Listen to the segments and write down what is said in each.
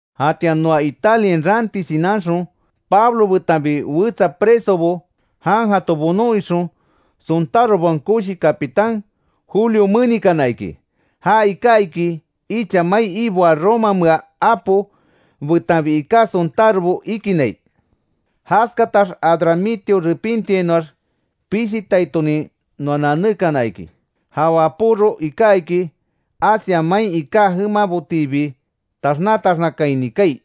Jatian noa Italiain raanti shinanxon, Pablo betanbi wetsa presobo, jan jato bonon ixon, sontárobaon koshi capitán Julio menikana iki. Ja iká iki, icha mai iboaa romamea apo betanbi iká sontárobo ikinai. Jaskatax Adramitio repintiainoax, pishitaitonin noa nanékana iki. Ja wapóro iká iki, Asia main iká jemabotiibi taxna taxnakaini kaai.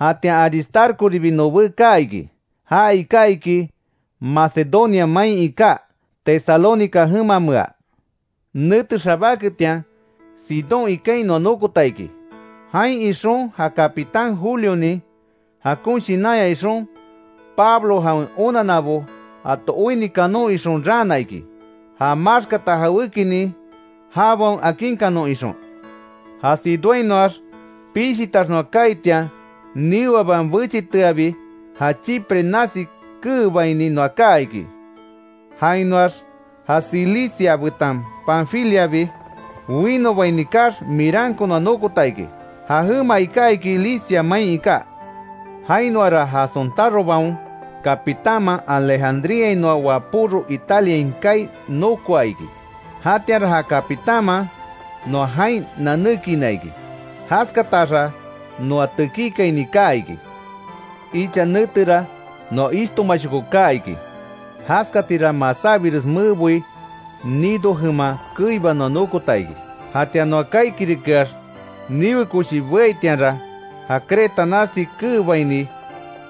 Jatian Aristarcoribi nobé kaa iki, ja iká iki Macedonia main iká, Tesalónica jemamea. Nete xabáketian, Sidón ikain noa nokota iki. Jain ixon ja capitán Julionin jakon shinanya ixon, Pablo jawen onanabo jato oinni kanon ixon raana iki. Já maxkata jawékinin jabaon akinkanon ixon. Ja Sidónhainoax pishitax noa kaaitian, niweaban bechiteabi, ja Chipre nasi keebaini noa kaa iki. Jainoax ja Cilicia betan Panfiliabi winobaini kaax, Miranko noa nokota iki, ja jema iká iki Licia main iká. Jainoara ja sontárobaon capitánman, Alejandríainoa wapóro Italiain kaai nokoa iki. Jatianra ja capitánman noa jain nanékiina iki, jaskataxa noa tekíkaini kaa iki. Icha netera noa ishtomashoko kaa iki, jaskatira masábires meboi, Gnido jema keiba noa nokota iki. Jatian noa kaaikirikeax niwe koshi beaitianra, ja Creta nasi keebaini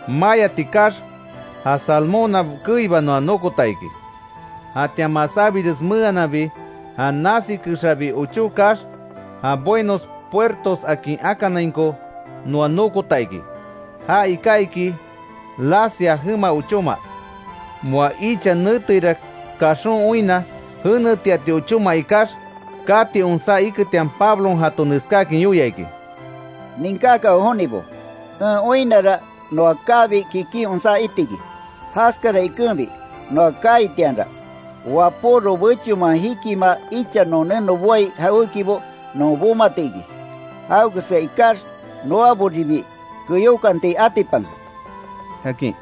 mayati kaax, ja Salmona keiba noa nokota iki. Jatian masábires mehananbi ja nasi kexabi ochó kaax, ja Buenos Puertos akin akanainko noa nokota iki. Ja iká iki Lasea jema ochóma. Moa icha neteira kaxon oinna, jenetiati ochóma ikax, kati onsá iketian, Pablon jato neskáakin yoia iki: —Ninkákanwe jonibo, en oinnara noa kaabi kikin onsá itiki, jaskara ikenbi noa kaaitianra, wapóro bechonman jikimaa icha non neno boai jawékibo non bomati iki, jawekeska ikax noaboribi keyokanti atipanke —akin.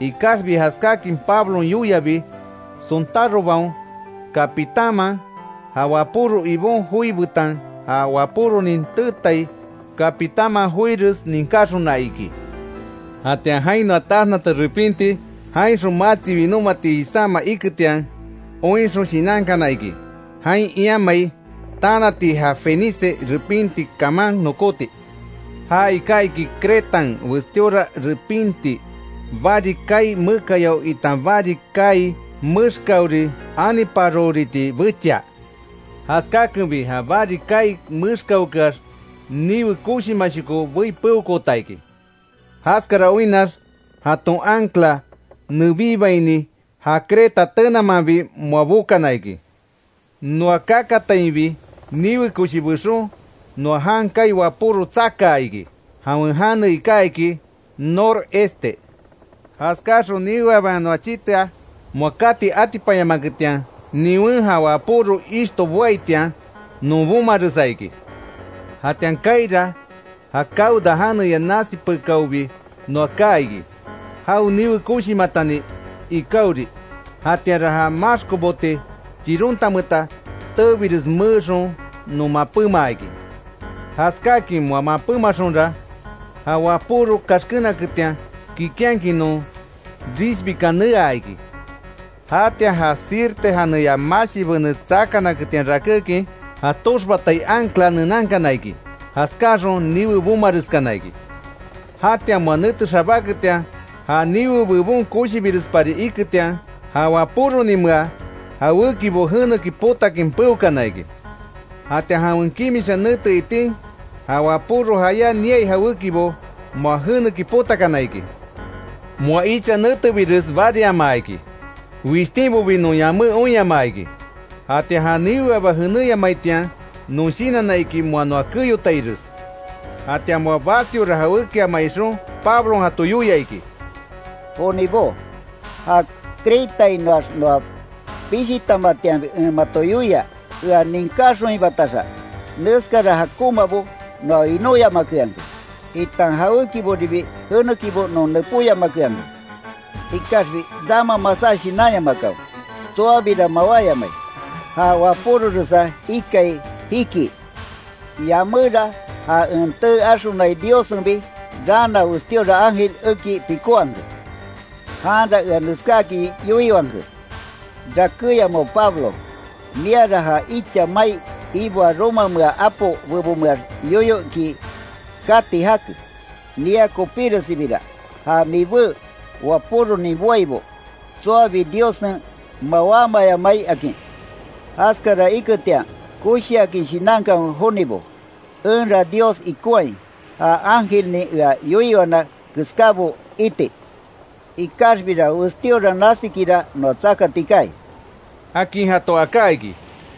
Ikaxbi jaskáakin Pablon yoiabi, sontárobaon capitánman, ja wapóro ibon joi betan ja wapóronin teetai capitánman joires ninkáxona iki. Jatian jain noa taxnata repinti, jainxon matsi winómati jisáma iketian, oinxon shinankana iki, jain iamai, tanati ja Fenice repinti kaman nokóti. Ja iká iki Cretan westíora repinti, bari kaai mekayao itan bari kaai mexkaori aniparohoriti bechia. Jaskákenbi ja bari kaai mexkaokeax, niwe koshimashoko bei peokoota iki, jaskara oinnax jaton ancla nebíbaini, ja Creta tenamanbi moa bokana iki. Noa kakatainbi, niwe koshi bexon, noa jan kaai wapóro tsakaa iki, jawen jane iká iki Nor este. Jaskáxon niweaban noa chitea, moa kati atipanyamaketian, niwen ja wapóro ishto boaitian non bomaresa iki. Jatian kaaira, ja Cauda janeya nasi pekáobi noa kaa iki, jao niwe koshimatani ikaori. Jatianra ja maxko bote chirontameta, teebires meexon non mapémaa iki. Jaskáakin moa mapémaxonra, ja wapóro kaxkénaketian, kikinhakin non risbikan neaa iki. Jatian ja Sirte janeya mashi benes tsakanaketian, rakékin, ja toxbatai ancla nenankana iki, jaskáaxon niwe bomareskana iki. Jatian moa nete xabáketian, ja niwe bebon koshibirespari iketian, ja wapóroninmea jawékibo jeneki potakin peokana iki. Jatian jawen kimisha nete itin, ja wapóro jayá niai jawékibo, moa jeneki potakana iki. Moa icha netebires bariamaa iki, wishtínbobi non yamé oinyamaa iki. Jatian ja niweaba jeneyamaitian non shinanna iki, moa noa keyotaires. Jatian moa basiora jawékiama ixon, Pablon jato yoia iki: —Jonibó, ja Cretainoax noa pishitamatianbi en mato yoia, ea ninkáxonhibataxa, neskara jakonmabo noa winóyamakeanke, itan jawékiboribi jenekibo non nepóyamakeanke. Ikaxbi rama masá shinanyamakanwe, tsoabira mawáyamai, ja wapóroresa ikai jikii. Yaméra ja en tee axonai Diossenbi raana westíora ángel eki pikówanke. Janra ea neskáakin yoiwanke: ‘Rakéyamawe Pablo, miara ja icha mai iboaa romamea apo bebonmeax yoyo iki kati jake, mia kopíresibira ja mibé wapóronin boaibo, tsoabi Diossen mawámayamai’, akin. Jaskara iketian koshiakin shinankanwe jonibo, enra Dios ikonhai, ja ángelnin ea yoiwana keskábo iti. Ikaxbira westíora nasikira noa tsakati kaai —akin jato aká iki.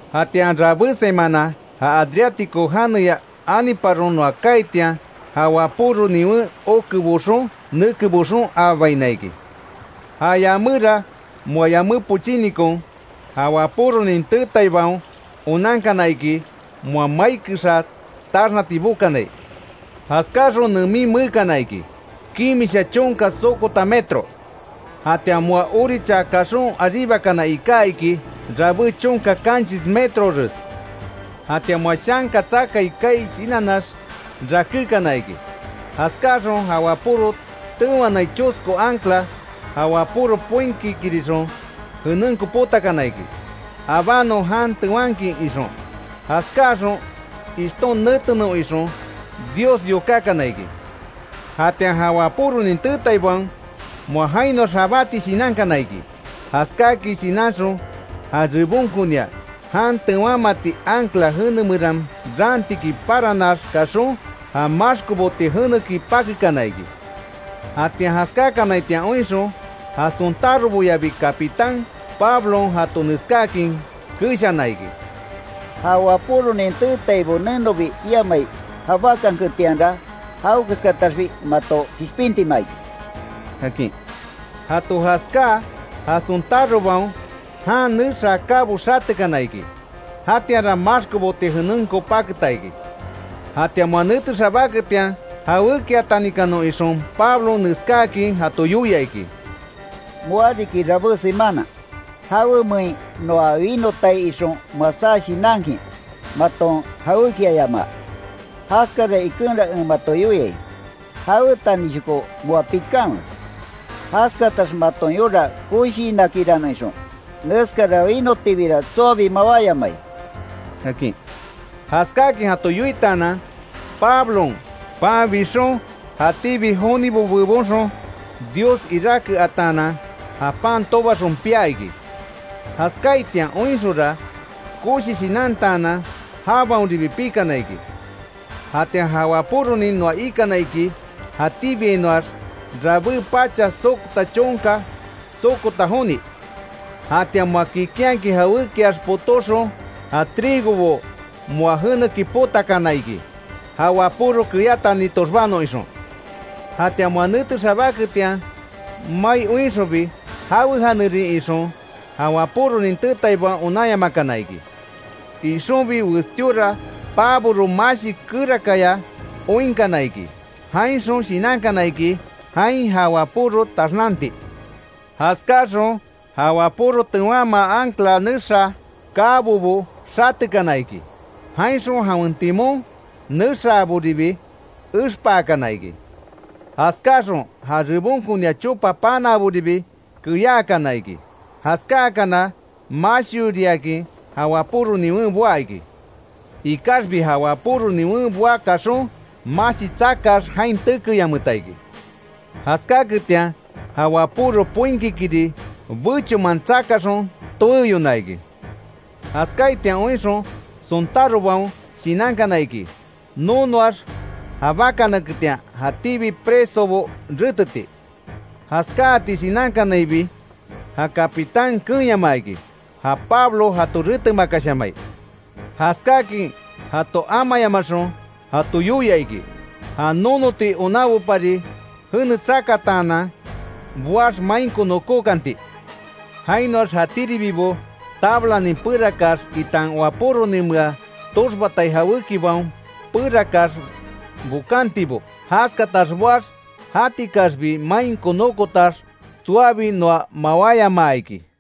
Jatian rabé semana ja Adriático janeya aniparon noa kaaitian, ja wapóro niwen oke boxon neke boxon aabaina iki. Ja yaméra moa yamé pochínikon, ja wapóronin teetaibaon onankana iki, moa mai kexa taxnati bokanai. Jaskáxon nemin meekana iki, kimisha chonka sokota metro, jatian moa orichaa kaxon aríbakana iká iki rabé chonka kanchis metrores. Jatian moa shanka tsakai kaai shinannax, rakékana iki. Jaskáxon, jan wapóro tewanai chosko ancla, ja wapóro poinkikirixon jenenko potakana iki, abanon jan tewankin ixon. Jaskáaxon ishton netenon ixon Dios yokákana iki. Jatian ja wapóronin teetaibaon, moa jainoax jabáti shinankana iki, jaskáakin shinanxon ja rebonkonia jan tewanmati ancla jene meran raantiki paranax kaxon, ja maxko bote jeneki pakekana iki. Jatian jaskákanaitian oinxon, ja sontároboyabi capitán, Pablon jato neskáakin keshana iki: —Ja wapóronin teetaibo nenobi iamai jabákanketianra jawekeskataxbi mato kishpintima iki —akin. Jato jaskáa ja sontárobaon jan nexaa kabo xatekana iki, jatianra maxko bote jenenko paketa iki. Jatian moa nete xabáketian, jawékiatanikanon ixon Pablon neskáakin jato yoia iki: —Moa riki rabé semana, jawemein noa winotai ixon masá shinankin, maton jawékiayamaa. Jaskara ikenra en mato yoiai, jawetanishoko moa pikanwe. Jaskatax maton yora koshiinakiranon ixon, neskara winotibira tsoabi mawáyamai —akin. Jaskáakin jato yoitaanan, Pablon pan bixon, jatíbi jonibo bebonxon Dios iráke ataanan, ja pan tobaxon pia iki. Jaskáaitian oinxonra, koshi shinantaanan, jabaonribi pikana iki. Jatian ja wapóronin noa ikana iki, jatíbiainoax rabé pacha sokota chonka sokota joni. Jatian moa kikinhakin jawékiax potóxon, ja trigobo moa jeneki potakana iki, ja wapóro keyátani toxbanon ixon. Jatian moa nete xabáketian mai oinxonbi, jawen janerin ixon, ja wapóronin teetaibaon onanyamakana iki. Ixonbi westíora paboro mashi kerakaya oinkana iki, jainxon shinankana iki, jain ja wapóro taxnanti. Jaskáaxon ja wapóro tewanmaa ancla nexaa kabobo xatekana iki. Jainxon jawen timón nexaaboribi expaakana iki. Jaskáaxon ja rebonkonia chopa panaaboribi keyaakana iki, jaskáakana mashioriakin ja wapóro niwen boá iki. Ikaxbi ja wapóro niwen boá kaxon mashi tsakaax, jain tekeyanmeta iki. Jaskáketian ja wapóro poinkikiri bechonman tsakaxon, toeyona iki. Jaskáaitian oinxon sontárobaon shinankana iki, nonoax jabakanaketian, jatíbi presobo reteti. Jaskáati shinankanainbi, ja capitán keenyamaa iki, ja Pablo jato retemakashamai. Jaskáakin jato amayamaxon jato yoia iki, ja nonoti onanbopari jene tsakataanan boax mainko nokókanti. Jainoax jatíribibo tablanin perakaax, itan wapóroninmea toxbatai jawékibaon perakaax bokantibo, jaskatax boax jatikaxbi mainko nokotax tsoabi noa mawáyamaa iki.